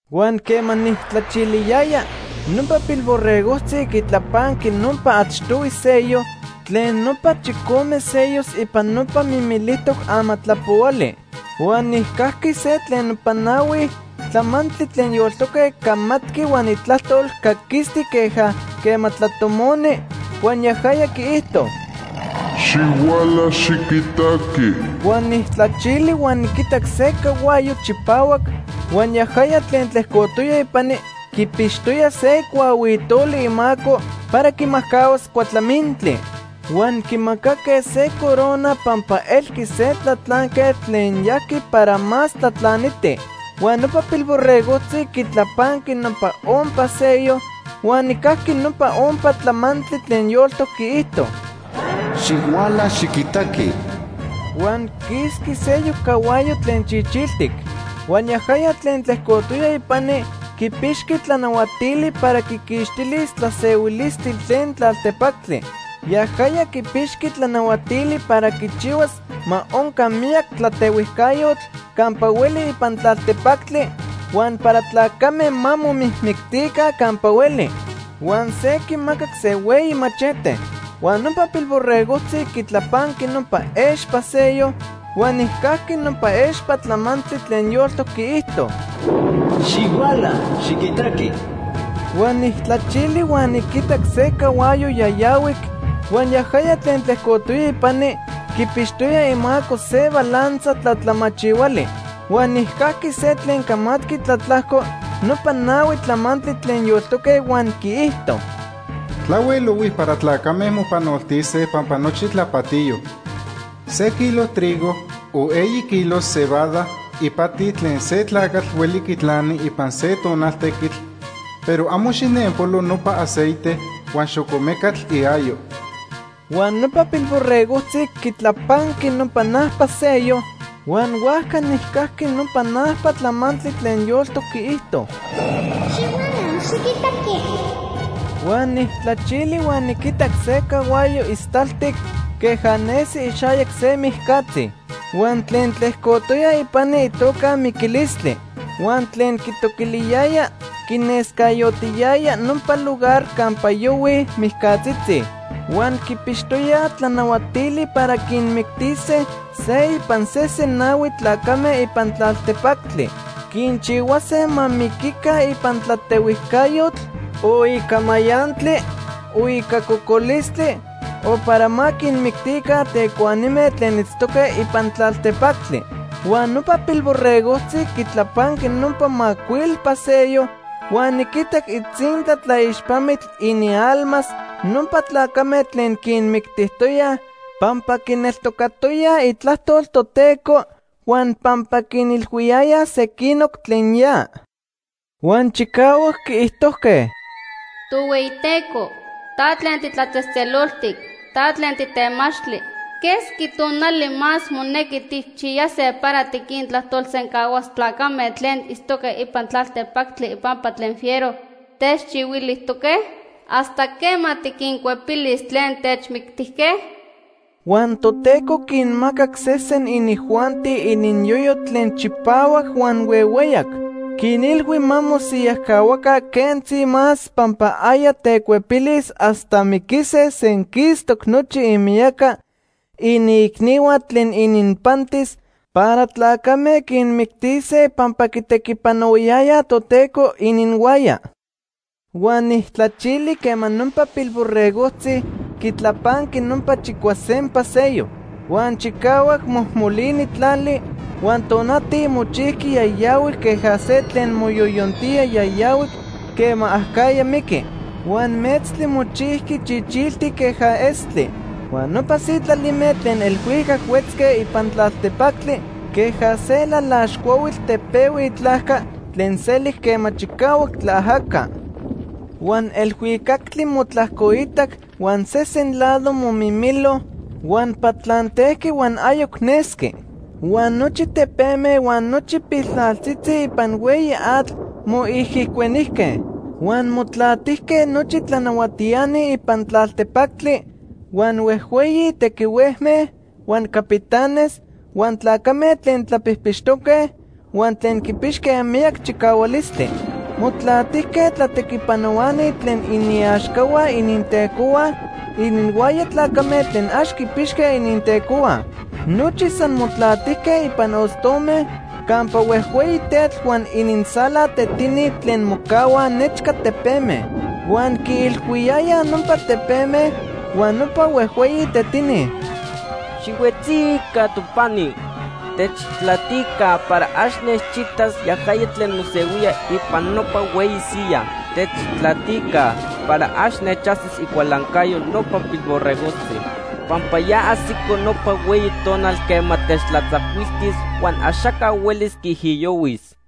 Huan quema nijtlachiliyaya, nopa Pilborregojtzi quitlapanqui nopa achtohui sello tlen nopa chicome sellos ipan nopa mimilijtoc amatlapohuali. Huan nijcajqui se tlen nopa nahui tlamantli tlen yoltoque camatqui huan itlajtol caquistic queja quema tlatomoni, huan yajaya quiijto: “¡Xihuala, xiquitaqui!” Huan nijtlachili huan niquitac se cahuayo chipahuac, huan yajaya tlen tlejcotoya ipani quipixtoya se cuahuitoli imaco para quimajcahuas cuatlamintli. Huan quimacaque se corona pampa elqui se tlatlanquetl tlen yajqui para más tlatlaniti. Huan nopa Pilborregojtzi quitlapanqui nopa ompa sello, huan nijcajqui nopa ompa tlamantli tlen yoltoc quiijto: “¡Xihuala, xiquitaqui!” Huan quisqui seyoc cahuayo tlen chichiltic. Huan yajaya tlen tlejcotoya ipani quipixqui tlanahuatili para quiquixtilis tlasehuilistli tlen tlaltepactli. Yajaya quipixqui tlanahuatili para quichihuas ma onca miyac tlatehuijcayotl campa hueli ipan tlaltepactli huan para tlacame ma momijmictica campa hueli. Huan se quimacac se hueyi machete. Huan nopa Pilborregojtzi quitlapanqui nopa expa sello, huan nijcajqui nopa expa tlamantli tlen yoltoc quiijto: “¡Xihuala, xiquitaqui!” Huan nijtlachili huan niquitac se cahuayo yayahuic, huan yajaya tlen tlejcotoya ipani quipixtoya imaco se balanza tlatlamachihuali. Huan nijcajqui se tlen camatqui tlatlajco nopa nahui tlamantli tlen yoltoque, huan quiijto: “Tlahuel ohui para tlacame mopanoltise pampa nochi tlapatiyo. Se kilo trigo o eyi kilos cebada ipati tlen se tlacatl hueli quitlani ipan se tonal tequitl, pero amo xijnenpolo nopa aceite huan xocomecatl iayo.” Huan nopa Pilborregojtzi quitlapanqui nopa najpa sello, huan huajca nijcajqui nopa najpa tlamantli tlen yoltoc quiijto: “¡Xihuala, xiquitaqui!” Huan nijtlachili huan niquitac se cahuayo istaltic queja nesi ixayac se mijcatzi. Huan tlen tlejcotoya ipani itoca Miquilistli. Huan tlen quitoquiliyaya quinescayotiyaya nopa lugar campa yohuij mijcatzitzi. Huan quipixtoyaj tlanahuatili para quinmictise se ipan sesen nahui tlacame ipan tlaltepactli. Quinchihuase ma miquica ipan tlatehuijcayotl, o ica mayantli, o ica cocolistli, o para ma quinmictica tecuanime tlen itztoque ipan tlaltepactli. Huan nopa Pilborregojtzi quitlapanqui nopa macuilpa sello, huan niquitac itzintla tlaixpamitl inialmas nopa tlacame tlen quinmictijtoyaj pampa quineltocayayaj itlajtol Toteco huan pampa quinilhuiyayaj sequinoc tlen ya. Huan chicahuac quiijtojque: “Tohueyiteco, ta tlen titlatzejtzeloltic. Ta tlen titemachtli. ¿Quesqui tonali más monequi tijchiyase para tiquintlajtolsencahuas tlacame tlen itztoque ipan tlaltepactli ipampa tlen fiero techchihuilijtoque? ¿Hasta quema tiquincuepilis tlen techmictijque?” Huan Toteco quinmacac sesen inijuanti ininyoyo tlen chipahuac huan huehueyac. Quinilhui ma mosiyajcahuaca quentzi más pampa aya tecuepilis hasta miquise senquistoc nochi imiyaca iniicnihua tlen ininpantis para tlacame quinmictise pampa quitequipanohuayayaj Toteco ininhuaya. Huan nijtlachili quema nopa Pilborregojtzi quitlapanqui nopa chicuasempa sello. Huan chicahuac mojmolini tlali, huan tonati mochijqui yayahuic queja se tlen moyoyontía yayahuic quema acajya miqui. Huan metztli mochijqui chichiltic queja estli. Huan nopa sitlalime tlen elhuicac huetzque ipan tlaltepactli queja se lalax cuahuitl tepehui itlajca tlen selic quema chicahuac tlaajaca. Huan elhuicactli motlajcoitac huan sesen lado momimilo huan patlantejqui huan ayoc nesqui. Huan nochi tepeme huan nochi piltlaltzitzi ipan hueyi atl moijicuenijque. Huan motlatijque nochi tlanahuatiani ipan tlaltepactli, huan huejhueyi tequihuejme, huan capitanes, huan tlacame tlen tlapijpixtoque, huan tlen quipixque miyac chicahualistli. Motlatijque tlatequipanohuani tlen iniaxcahua inintecohua, ininhuaya tlacame tlen ax quipixque inintecohua. Nochi san motlatijque ipan ostome campa huejhueyi tetl huan inintzala tetini tlen mocahuaj nechca tepeme. Huan quiilhuiyayaj nopa tepeme huan nopa huejhueyi tetini: “Xihuetzica topani. Techtlatica para ax nechitas yajaya tlen mosehuía ipan nopa hueyi siyaj. Techtlatica para ax nechajsis icualancayo nopa Pilborregojtzi. Pampa ya ajsico nopa hueyi tonal quema techtlatzacuiltis huan axaca huelis quiijiyohuis.”